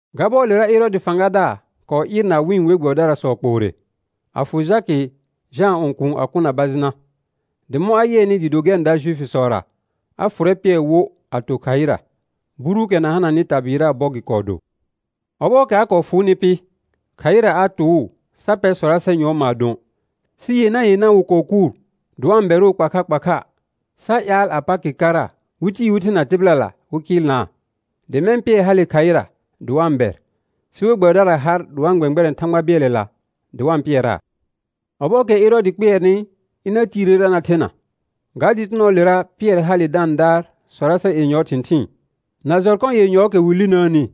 Ga bɔɔlera Ɛrɔɔdɩ fãgadaar kɔɔ ɩɩrna wɩ̃ we gbɛbɩdarasɔ kpoore, a fʋ Jakɩ, Jãa õkuun a kʋ na bajɩna. Dɩ mɔ̃ a yɩɛnɩ dɩɩ do gɛr n da Juifisɔra, a fʋrɛ Pɩɛr wo a to khaɩra. Buruukɛ na hananɩ tabɩɩraa bɔ gɩ kɔɔ do. Ɔbɔɔkɛ a kɔɔ fʋʋnɩ pɩ, khaɩra a tʋʋ sa pɛr sɔrasɛ yʋɔr maadõ, sɩ yenã yenã wɩ kɔɔ kʋʋr dɩ wa-n bɛrʋʋ kpa kha kpa kha, sa ƴaal a Pakɩ kara wɩ tii wɩ thena tɩbɩlala wɩ kɩɩlnaa. Dɩ mɛ̃ Pɩɛr hale khaɩra dɩ wa-n bɛr, sɩ we gbɛbɩdara har dɩ wa-n gbɛ̃gbɛrɛ̃ Thãgba bɩɛlɛla dɩ wa-n pɩɛraa. Ɔbɔɔkɛ Ɛrɔɔdɩ kpɩɛrnɩ ɩna tiirera na thena, ga dɩtɩnɔɔlera Pɩɛr hale da-n daar sɔrasɛ yenyɔɔ thɩ̃thɩɩn, na jɔrkɔ yenyɔɔkɛ wɩ linəəni,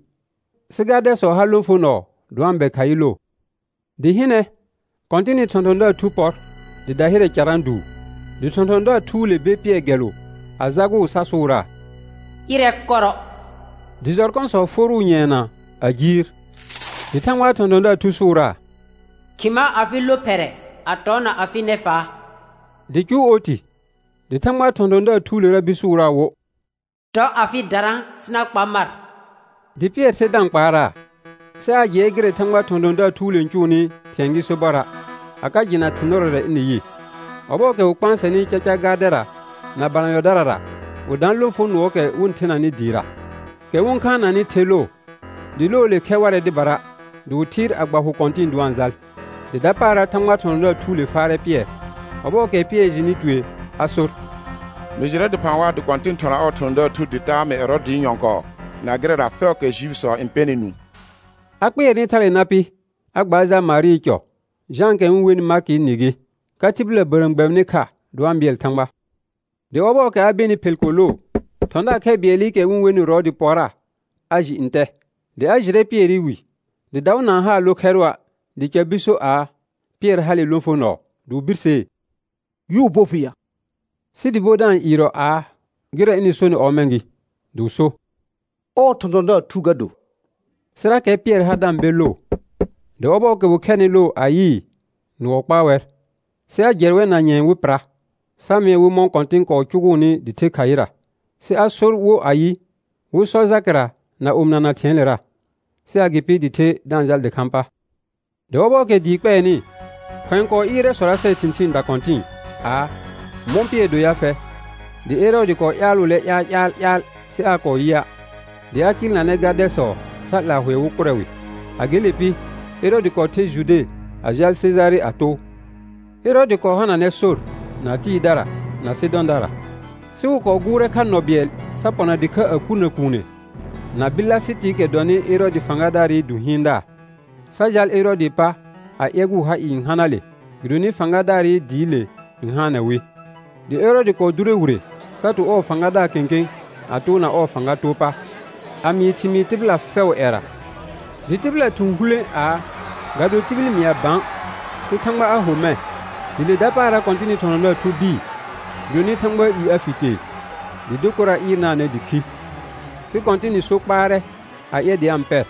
sɩ gardɛsɔ ha lõfonɔɔ dɩ wa-n bɛr khaɩ loo. Dɩ hɩnɛ, Kɔ̃tɩnɩ thɔ̃thɔ̃daar thu pɔr dɩ dahɩrɛ carã duu. Dɩ thɔ̃thɔ̃daar thuule ber Pɩɛr gɛlʋ a jagʋʋ sa sʋʋraa: Ɩrɛ kɔrɔ. Dɩ jɔrkɔsɔ forʋʋ nyɛɛna a jiir. Dɩ Thãgbaa thɔ̃thɔ̃daar thu sʋʋraa: Khɩma afɩ lophɛrɛ, a tɔna afɩ nɛfaa. Dɩ cʋʋ oti. Dɩ Thãgbaa thɔ̃thɔ̃daar thuulera bir sʋʋraa wo: Tɔ afɩ darã sɩ na kpa mar. Dɩ Pɩɛr the da-n kpaaraa, sɩ aa jɩɛ gɩrɛ Thãgbaa thɔ̃thɔ̃daar thuule n cʋʋnɩ thɩ̃ɛ gɩ sobɔra', a ka jɩna thɩ̃ nɩrɔrɛ ɩnɩ yɩ. Ɔbɔɔkɛ wɩ kpãasɛnɩ caca gardɛra na balanyɔdarara, wɩ daan lõfonʋɔɔkɛ wɩ-n thenanɩ dɩɩra, kɛ wɩ-n khaananɩ the loo, dɩ loole khɛr warɛ dɩbara, dɩ wɩ thɩɩr a gba hʋ kɔ̃tɩ̃ɩ dɩ wa-n jal. Dɩ dapaara Thãgbaa thɔ̃thɔ̃daar thuule faarɛ Pɩɛr. Ɔbɔɔkɛ Pɩɛr jɩnɩ tue a sor: Mɩ jɩrɛ dɩphã waa dɩ Kɔ̃tɩn thɔna ɔɔ thɔ̃thɔ̃daar thu dɩ taa mɩ Ɛrɔɔdɩ nyɔ̃kɔɔ na gɩrɛra fɛʋʋkɛ Juifisɔ n pɛnɩ nũu. A kpɩɛrnɩ thale na pɩ, a gbaar jal Marɩɩ cɔ; Jãakɛ wɩ-n wenɩ Markɩɩ nɩ gɩ, ka tɩbɩla bərəəm gbɛbɩnɩ kha dɩ wa-n bɩɛl Thãgba. Dɩ ɔbɔɔkɛ a benɩ phel ko loo, thɔ̃daar khɛ bɩɛlɩkɛ wɩ-n wenɩ Rɔɔdɩ pɔrra a jɩ ntɛ. Dɩ a jɩrɛ Pɩɛrɩ wi; dɩ daʋ na-n haa lo khɛrʋa', dɩ ca bir so aa: Pɩɛr hale lõfonɔɔ. Dɩ wɩ birsee: Yʋʋ bo fɩ yaa? Sɩ dɩ bo da-n ɩɩrɔ aa, gɩrɛ ɩnɩ sonɩ ɔmɛ̃ gɩ. Dɩ wɩ so: Ɔɔ thɔ̃thɔ̃daar thu ga do. Sɩrakɛ Pɩɛr har da-n be loo. Dɩ ɔbɔɔkɛ wɩ khɛrnɩ loo a yɩɩ nʋɔ kpaa wɛr. Sɩ a jɛ wɛr na nyɛ̃ɛ wɩ pɩra, sa mɩɛ wɩ mɔ̃ Kɔ̃tɩn kɔɔ cʋgʋʋnɩ dɩ the khaɩra. Sɩ a sor wo ayɩ, wɩ sɔ Jakɩra na omɩnana thɩ̃ɛɛlera. Sɩ agɩpɩ dɩ the da-n jal dɩkhãa pa. Dɩ ɔbɔɔkɛ dɩɩ kpɛɛnɩ, khʋ̃ɛ kɔɔ ɩɩrɛ sɔrasɛɛ thɩ̃thɩɩn dakɔ̃tɩ̃ɩ aa: Mɔ̃ Pɩɛr do ya fɛ? Dɩ Ɛrɔɔdɩ kɔɔ ƴaalʋʋlɛ ƴaal ƴaal ƴaal sɩ aa kɔɔ yɩa', dɩ a kɩɩlnanɛ gardɛsɔ sa 'laa hʋɛ wɩ kʋrɛ wɩ. A gele pɩ, Ɛrɔɔdɩ kɔɔ ther Jude a jal Sejare a too. Ɛrɔɔdɩ kɔɔ hananɛ sor na Tɩɩrdara na Sɩdɔ̃dara. Sɩ wɩ kɔɔ gʋʋrɛ kha nɔ bɩɛl sa pɔna dɩkha a kurnə kuune na Bɩlasɩtɩɩkɛ dɔnɩ Ɛrɔɔdɩ fãgadaarɩ du hɩɩndaar, sa jal Ɛrɔɔdɩɩ pa a ƴɛgʋʋ ha ɩɩ n hana le gɩdonɩ fãgadaarɩ dɩɩle n haanɛ wɩ. Dɩ Ɛrɔɔdɩ kɔɔ dʋrɛ wire sa to ɔɔ fãgadaar kẽkẽ a toona ɔɔ fãga too pa, a mɩɩ thɩmɩɩr tɩbɩla fɛʋʋ ƴɛra. Dɩ tɩbɩla thʋ̃ hulẽ aa, ga do tibil n mɩa bã sɩ Thãgba a ho mɛ̃. Dɩ le dapaara Kɔ̃tɩnɩ thɔ̃thɔ̃daar thu bɩɩ, gɩdonɩ Thãgbaa i a fi tee. Dɩ dokora ɩɩrnaanɛ dɩ khi. Sɩ Kɔ̃tɩnɩ so kpaarɛ a ƴɛr dɩ a-n pɛr.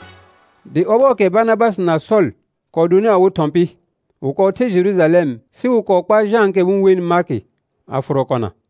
Dɩ ɔbɔɔkɛ Barnabasɩ na Sɔl kɔɔ donɩ awɩ thɔ̃ pɩ, wɩ kɔɔ ther Jerujalɛm sɩ wɩ kɔɔ kpar Jãakɛ wɩ-n wenɩ Markɩ a fʋrɔ kɔna.